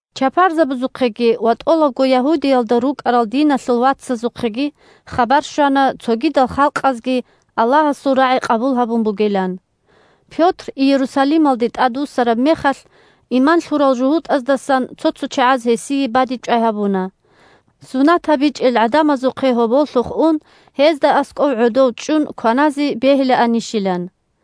Чапарзабазухъеги ва тӀолабго Ягьудиялда рукӀарал диналъул вацазухъеги хабар щвана цогидал халкъазги Аллагьасул рагӀи къабул гьабун бугилан. Пётр Иерусалималде тӀадвуссараб мехалъ, иман лъурал жугьутӀаздасан цо-цо чагӀаз гьесие бадибчӀвай гьабуна, сунат гьабичӀел гӀадамазухъе гьоболлъухъ ун, гьезда аскӀов гӀодов чӀун кваназе бегьилаанищилан.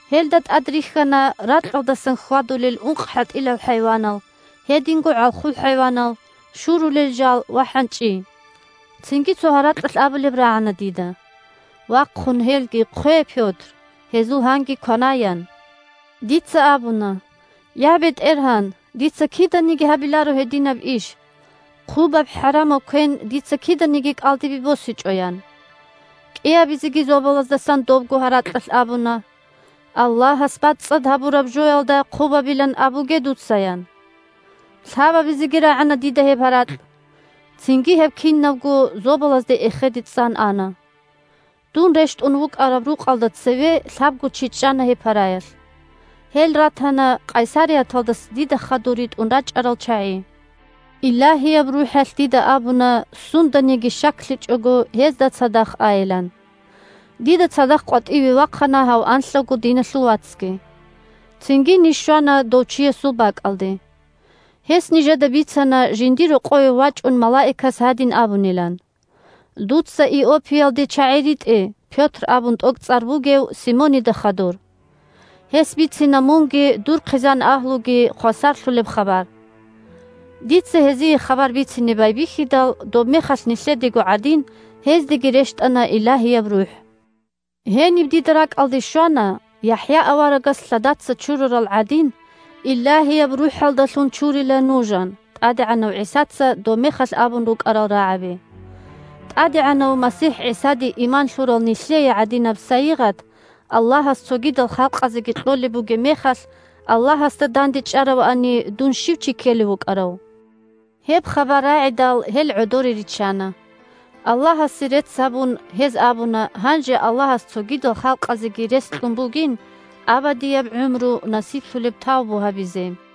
Гьелда тӀад рихьана ракьалдасан хьвадулел ункъхӀатӀилал хӀайванал, гьединго гӀалхул хӀайванал, шурулел жал ва хӀанчӀи. Цинги цо гьаракьалъ абулеб рагӀана дида: «Вахъун гьелги хъве, Пётр, гьезул гьанги кванай», – ян. Дица абуна: «Я, БетӀергьан! Дица киданиги гьабиларо гьединаб иш. Хъубаб, хӀарамаб квен дица киданиги кӀалдибе босичӀо», – ян. КӀиабизеги зобалаздасан добго гьаракьалъ абуна: «Аллагьас бацӀцӀад гьабураб жоялда хъубабилан абуге дуца», – ян. Лъабабизеги рагӀана дида гьеб гьаракь. Цинги гьеб кинабго зобалазде эхеде цӀан ана. Дун рещтӀун вукӀараб рукъалда цеве лъабго чи чӀана гьеб параялъ. Гьел ратана Къайсарияталдаса дида хадур ритӀун рачӀарал чагӀи. Илагьияб РухӀалъ дида абуна сунданиги щаклъичӀого гьезда цадахъ айилан. Дида цадахъ къватӀиве вахъана гьав анлъавго диналъул вацги. Цинги ниж щвана дов чиясул бакӀалде. Гьес нижеда бицана жиндир рокъове вачӀун малаикас гьадин абунилан: «Дуца Иоппиялде чагӀи ритӀе Пётр абун тӀокӀцӀар бугев Симонида хадур. Гьес бицина мунги дур хъизан-агьлуги хвасарлъулеб хабар». Дица гьезие хабар бицине байбихьидал, добмехалъ нилъедего гӀадин, гьездеги рещтӀана Илагьияб РухӀ. Гьениб дида ракӀалде щвана: «ЯхӀя аварагас лъадаца чурарал гӀадин, Илагьияб РухӀалдалъун чурила нуж», – ан ТӀадегӀанав ГӀисаца добмехалъ абун рукӀарал рагӀаби. ТӀадегӀанав МасихӀ ГӀисаде иман лъурал нилъее гӀадинаб сайигъат Аллагьас цогидал халкъазеги кьолеб бугеб мехалъ Аллагьасда дандечӀаравани, дун щив чи ккелев вукӀарав? Гьеб хабар рагӀидал гьел гӀодоре риччана. Аллагьасе рецц гьабун гьез абуна гьанже Аллагьас цогидал халкъазеги рес кьун бугин абадияб гӀумру насиблъулеб тавбу гьабизе.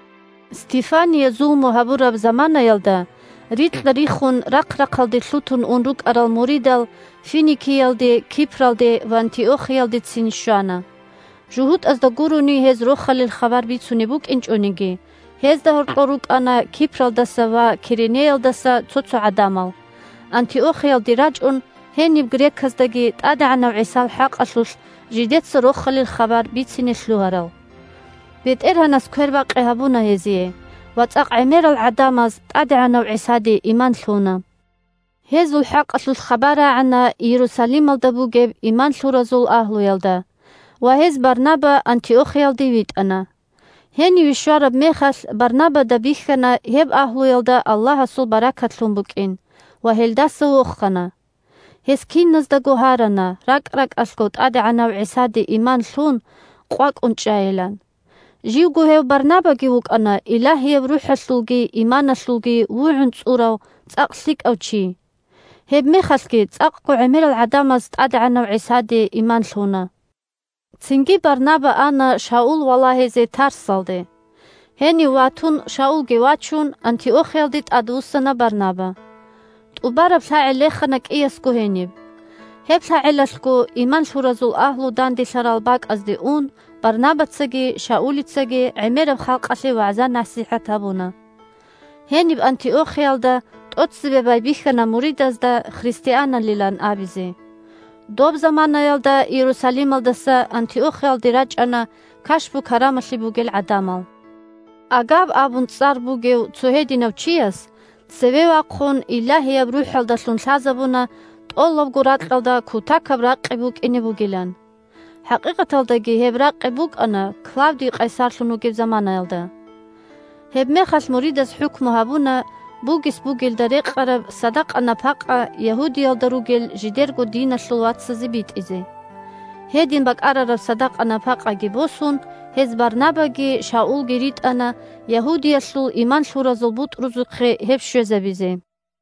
Стефание зулму гьабураб заманаялда рикьа-риххун рахъ-рахъалде лъутун ун рукӀарал муридал Финикиялде, Кипралде ва Антиохиялдецин щвана. ЖугьутӀазда гурони гьез Рохалил хабар бицунеб букӀинчӀониги, гьезда гьоркьор рукӀана Кипралдаса ва Киренеялдаса цо-цо гӀадамал, Антиохиялде рачӀун, гьениб греказдаги ТӀадегӀанав ГӀисал хӀакъалъулъ жидеца Рохалил хабар бицине лъугьарал. БетӀергьанас квербакъи гьабуна гьезие, ва цӀакъ гӀемерал гӀадамаз ТӀадегӀанав ГӀисаде иман лъуна. Гьезул хӀакъалъулъ хабар рагӀана Иерусалималда бугеб иман лъуразул агьлуялда ва гьез Барнаба Антиохиялде витӀана. Гьениве щвараб мехалъ Барнабада бихьана гьеб агьлуялда Аллагьасул баркат лъун букӀин ва гьелдаса вохана. Гьес киназдаго гьарана ракӀ-ракӀалъго ТӀадегӀанав ГӀисаде иман лъун къвакӀун чӀайилан. Живго гьев Барнабаги вукӀана Илагьияб РухӀалъулги иманалъулги вугӀун цӀурав цӀакъ лъикӀав чи. Гьебмехалъги цӀакъго гӀемерал гӀадамаз ТӀадегӀанав ГӀисаде иман лъуна. Цинги Барнаба ана Шаул валагьизе Тарсалде. Гьенив ватун, Шаулги вачун, Антиохиялде тӀадвуссана Барнаба. ТӀубараб лъагӀел рехана кӀиясго гьениб. Гьеб лъагӀелалъго иман лъуразул агьлу данделъарал бакӀазде ун Барнабацаги Шаулицаги гӀемераб халкъалъе вагӀза-насихӀат гьабуна. Гьениб Антиохиялда тӀоцебе байбихьана муридазда христианалилан абизе. Доб заманаялда Иерусалималдаса Антиохиялде рачӀана кашпу-карамалъи бугел гӀадамал. Агаб абун цӀар бугев цо гьединав чияс, цеве вахъун, Илагьияб РухӀалдалъун лъазабуна тӀолабго ракьалда кутакаб ракъи букӀине бугилан. (ХӀакъикъаталдаги гьеб ракъи букӀана Клавдий къайсарлъун вугеб заманаялда.) Гьебмехалъ муридаз хӀукму гьабуна бугес бугелда рекъараб садакъа-напакъа Ягьудиялда ругел жидерго диналъул вацазе битӀизе. Гьедин бакӀарараб садакъа-напакъаги босун, гьез Барнабаги Шаулги ритӀана Ягьудиялъул иман лъуразул бутӀрузухъе гьеб щвезабизе.